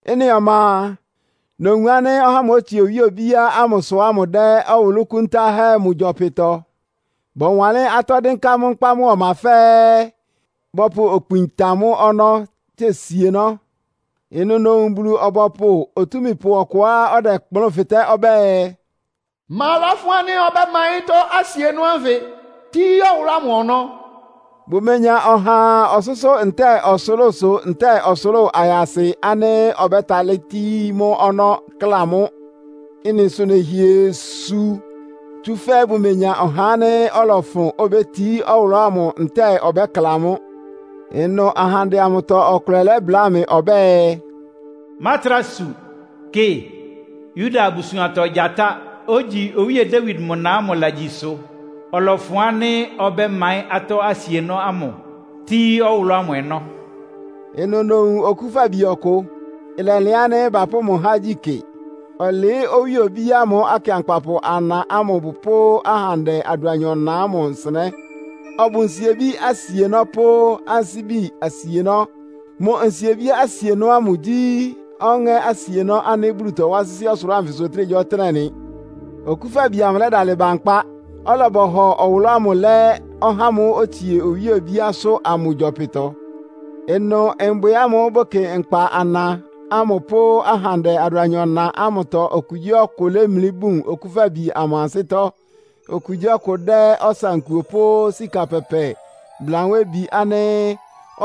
Ɩ́nɩ ɔma a, nowun ánɩ́ ɔhá ámʋ́ʋ́ otsie owíe obíá ámʋsʋ ámʋ dɛ́ ɔwʋlʋ́ kúntáhɛ́ mʋ gyɔpɩtɔ. Bɔwanlɩ́n atɔ́ dɩ́nká mʋ́ nkpá mʋ́a mʋ́ ɔma fɛ́ɛ́, bɔpʋ okpin tan mʋ́ ɔnɔ́ tse sienɔ́. Ɩnʋ nowun Bulu-ɔbɔpʋ otúmípʋ ɔkʋá ɔdɛkplʋ́n fɩtɛ́ ɔbɛ́ɛ, “Ma lɔ́fʋn ánɩ́ ɔbɛ́maɩ́n atɔ́ asienɔ́ ánfɩ, tíí ɔwʋlʋ́ ámʋ ɔnɔ́?” Bʋmenya ɔhaa ɔsʋ́sʋ́ ntɛ́ɛ ɔsʋlʋ́sʋ ntɛ́ɛ ɔsʋlʋ́ʋ ayasɩ ánɩ́ ɔbɛ́talɩ́ tíí mʋ́ ɔnɔ́, kla mʋ́. Ɩ́nɩ sʋ nɛhɩɛ su, tsúfɛ́ bʋmenya ɔhá ánɩ́ ɔlɔfʋn, obétií ɔwʋlʋ́ ámʋ ntɛ́ɛ ɔbɛ́kla mʋ́. Ɩnʋ ahandɛ amʋtɔ ɔkʋlɛ lɛ́bláa mɩ ɔbɛ́ɛ, “Mátrá su. Kɩ, Yuda abusuantɔ Gyatá, ogyi Owíe Dawid mʋ na ámʋ lagyi ɩsʋ. Ɔlɔfʋn ánɩ́ ɔbɛ́maɩ́n atɔ́ asienɔ́ ámʋ, tíí ɔwʋlʋ́ ámʋ ɔnɔ́.” Ɩnʋ nowun Okúfabi ɔkʋ. Ɩlɛlɩan ánɩ́ bapʋ́ mʋ há igyí kɩ. Ɔlɩɩ́ owíe obíá ámʋ, akɩankpapʋ ana ámʋ pʋ́ ahandɛ adʋanyɔ-na ámʋ nsɩnɛ́. Ɔbʋ nsiebí asienɔ́ pʋ́ ansíbi asienɔ́. Mʋ ansíbi asienɔ́ ámʋ gyí ɔŋɛ́ asienɔ́ ánɩ́ Bulu tɔwá sɩ́sɩ́ ɔsʋlʋ́ʋ anfɩsʋ ɔtɩ́nɛgyíɔtɩ́nɛ́ nɩ. Okúfabi amʋ lɛ́dalɩ ba nkpá, ɔlɔbɔhɔ ɔwʋlʋ́ ámʋ lɛ́ ɔhá ámʋ́ʋ́ otsie owíe obíásʋ́ amʋ gyɔpɩtɔ. Ɩnʋ mbwɩ ámʋ́ʋ́ bʋkɩ nkpa ana ámʋ pʋ́ ahandɛ adʋanyɔ-na ámʋtɔ okugyíɔkʋ lémlí bún Okúfabi amʋ ansɩ́tɔ́. Okugyíɔkʋ dɛ́ ɔsankuo pʋ́ sika pɛpɛ blanwébi ánɩ́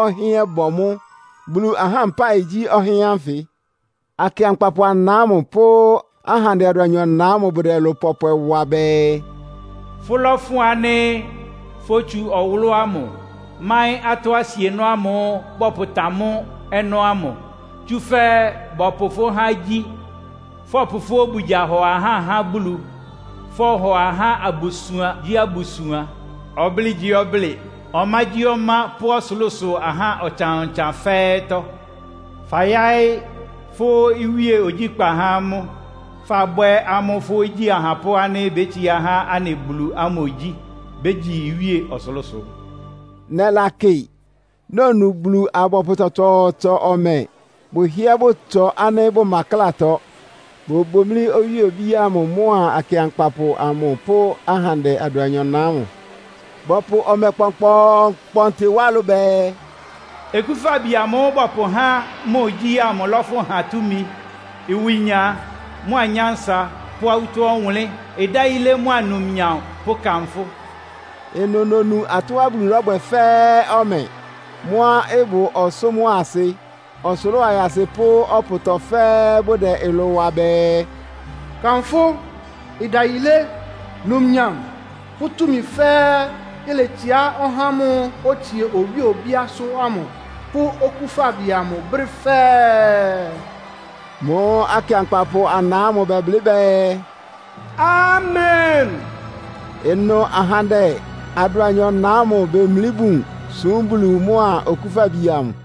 ɔhɩ́ɛ́n bɔ mʋ́. Bulu ahá mpáɩ gyí ɔhɩ́ɛ́n ánfɩ. Akɩankpapʋ ana ámʋ pʋ́ ahandɛ adʋanyɔ-na ámʋ bʋdɛ ɩlʋ pɔpwɛ wa bɛɛ, “Fʋ́lɔ́fʋn ánɩ́ fótsu ɔwʋlʋ́ ámʋ, máɩ́n atɔ́ asienɔ́ ámʋ́ʋ́ bɔpʋtan mʋ́ ɔnɔ́ ámʋ. Tsúfɛ́ bɔpʋ fʋ́ há igyí, fɔpʋ fʋ́ obugya hɔ ahá há Bulu. Fɔhɔ ahá abusuangyíabusuan, ɔblɩ́ɩgyíɔblɩ́ɩ, ɔmágyíɔmá pʋ́ ɔsʋlʋ́sʋ ahá ɔtsan-ɔtsan fɛ́ɛ́tɔ́. Fayáɩ́ fʋ́ iwíe ogyíkpá há amʋ́, fabwɛ́ amʋ́ fʋ́ igyí ahapʋ́ ánɩ́ bétsiá há anɩ Bulu ámʋ igyí. Bégyi iwíe ɔsʋlʋ́sʋ.” Nɛlakɩ, nonu Bulu-abɔpʋ tsɔtsɔɔtsɔ ɔmɛ. Bʋhɩ́ɛ́ bʋtsɔ ánɩ́ bʋma ɩklátɔ. Bobomlí owíe obíá ámʋ mʋ́a akɩankpapʋ amʋ pʋ́ ahandɛ adʋanyɔ-na ámʋ. Bɔpʋ ɔmɛ kpɔnkpɔɔnkpɔntɩ wá ɩlʋ bɛɛ, “Okúfabi amʋ́ʋ́ bɔpʋhá mʋ igyí ámʋ lɔ́fʋn ha túmi, ɩwɩnya mʋ́a nyánsa pʋ́ awútɔ́ ɔwʋnlɩ́n, ɩdayilé mʋ́a numnyam pʋ́ kanfʋ́.” Ɩnʋ nonu atɔ́á Bulu lɔ́bwɛ fɛ́ɛ́ ɔmɛ. Mʋ́á ɩbʋ ɔsʋ́ mʋ́a asɩ, ɔsʋlʋ́ʋ ayasɩ pʋ́ ɔpʋtɔ fɛ́ɛ́, bʋdɛ ɩlʋ wa bɛɛ, “Kanfʋ́, ɩdayilé, numnyam pʋ́ túmi fɛ́ɛ́ iletsiá ɔhá ámʋ́ʋ́ otsie owíe obíásʋ́ amʋ pʋ́ Okúfabi amʋ brɛ́ fɛ́ɛ́!” Mʋ́ʋ́ akɩankpapʋ ana ámʋ bɛblɩ́ bɛɛ, “Amen!” Ɩnʋ ahandɛ adʋanyɔ-na ámʋ bemlí bun súm Bulu mʋa Okúfabi amʋ.